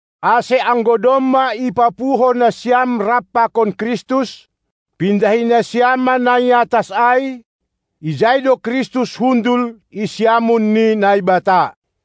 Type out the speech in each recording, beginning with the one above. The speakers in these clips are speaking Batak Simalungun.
Ase anggo domma ipapuho nasiam rap pakon Kristus, pindahi nasiam ma na i atas ai; ijai do Kristus hundul i siamun ni Naibata.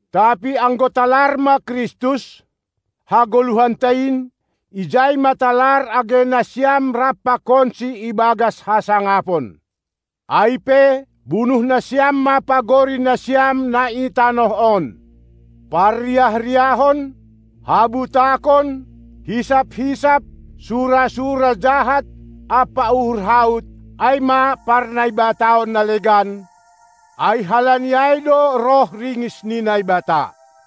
Tapi, anggo talar ma Kristus, hagoluhanta in, ijai ma talar age nasiam rap pakonSi ibagas hasangapon. Ai pe, bunuh nasiam ma pagori nasiam, na i tanoh on: Parriah-riahon, habutakon, hisap-hisap, sura-sura jahat ampa uhur haut, ai ma parnaibataon na legan, ai halani ai do roh ringis ni Naibata.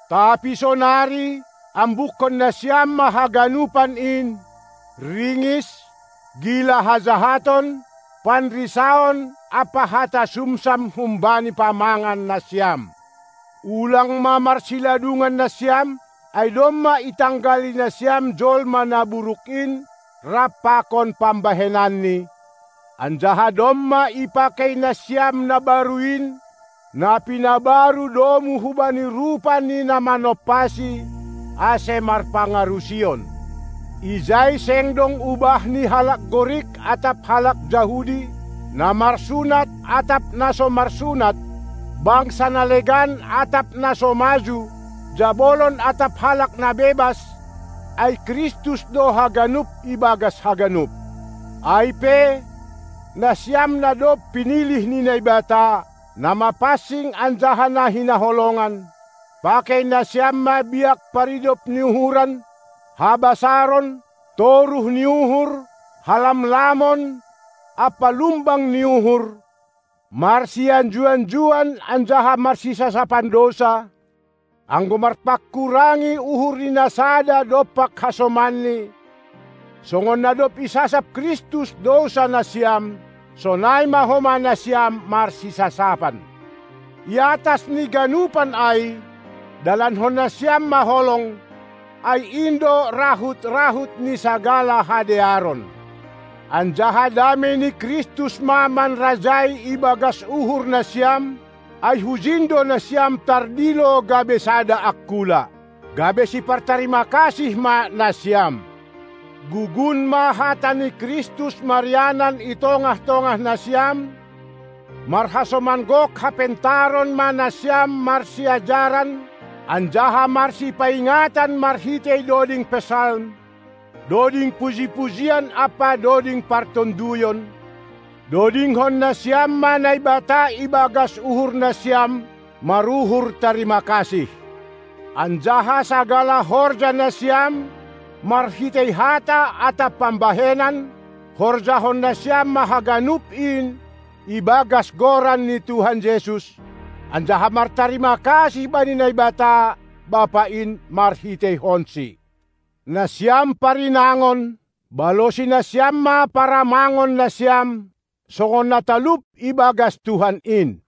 Tapi sonari, ambukkon nasiam ma haganupan in: Ringis, gila hajahaton, panrisaon ampa hata sumsam humbani pamangan nasiam. Ulang ma marsiladungan nasiam, ai domma itanggali nasiam jolma na buruk in rap pakon pambahenanni, anjaha domma ipakei nasiam na baru in, na pinabaru domu hubani rupa ni na manompasi, ase marpangarusion. Ijai seng dong ubah ni halak Gorik atap halak Jahudi, na marsunat atap na so marsunat, bangsa na legan atap na so maju, jabolon atap halak na bebas, ai Kristus do haganup ibagas haganup. Ai pe, nasiam na dob pinilih ni Naibata, na mapansing anjaha na hinaholongan, pakei nasiam ma biak paridop ni uhuran, habasaron, toruh ni uhur, halamlamon, ampa lumbang ni uhur, marsianju-anjuan anjaha marsisasapan dousa, anggo marpanghurangi uhur ni na sada dompak hasomanni; songon na dob isasap Kristus dousa nasiam, sonai ma homa nasiam marsisasapan. I atas ni ganupan ai dalankon nasiam ma holong, ai in do rahut-rahut ni sagala hadearon. Anjaha damei ni Kristus ma manrajai ibagas uhur nasiam, ai hujin do nasiam tardilo gabe sada angkula. Gabe sipartarima kasih ma nasiam. Gugun ma hata ni Kristus marianan i tongah-tongah nasiam; marhasoman gok hapentaron ma nasiam marsiajaran anjaha marsipaingatan marhitei doding Psalm, doding puji-pujian ampa doding partonduyon; dodingkon nasiam ma Naibata ibagas uhur nasiam maruhur tarima kasih. Anjaha sagala horja nasiam, marhitei hata atap pambahenan, horjahon nasiam ma haganup in ibagas goran ni Tuhan Jesus, anjaha martarima kasih bani Naibata, Bapa in, marhiteihonsi. Nasiam parinangon, balosi nasiam ma paramangon nasiam, songon na talup ibagas Tuhan in.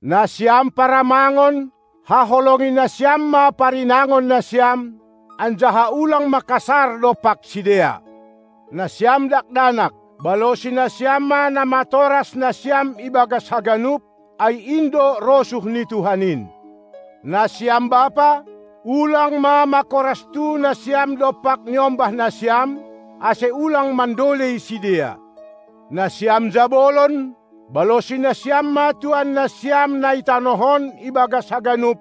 Nasiam paramangon, haholongi nasiam ma parinangon nasiam, anjaha ulang ma kasar dompak sidea. Nasiam dakdanak, balosi nasiam ma namatoras nasiam ibagas haganup, ai in do rosuh ni Tuhan in. Nasiam bapa, ulang ma makorastu nasiam dompak niombah nasiam, ase ulang mandolei sidea. Nasiam jabolon, balosi nasiam ma tuan nasiam na i tanoh on ibagas haganup;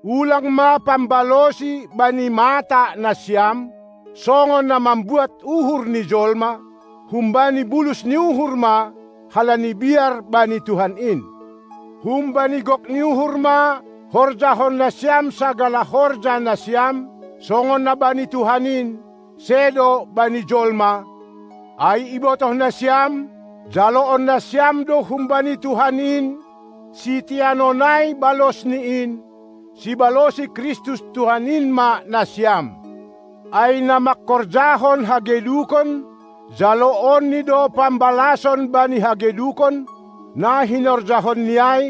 ulang ma pambalosi bani mata nasiam, songon na mambuat uhur ni jolma, humbani bulus ni uhur ma, halani biar bani Tuhan in! Humbani gok ni uhur ma horjahon nasiam sagala horja nasiam, songon na bani Tuhan in, sedo bani jolma, ai ibotoh nasiam, jaloon nasiam do humbani Tuhan in siteanon ai balos ni in; sibalosi Kristus Tuhan in ma nasiam. Ai na mangkorjahon hagedukon, jaloonni do pambalason bani hagedukon, na hinorjahonni ai,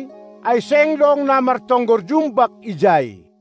ai seng dong na martonggor jumbak ijai.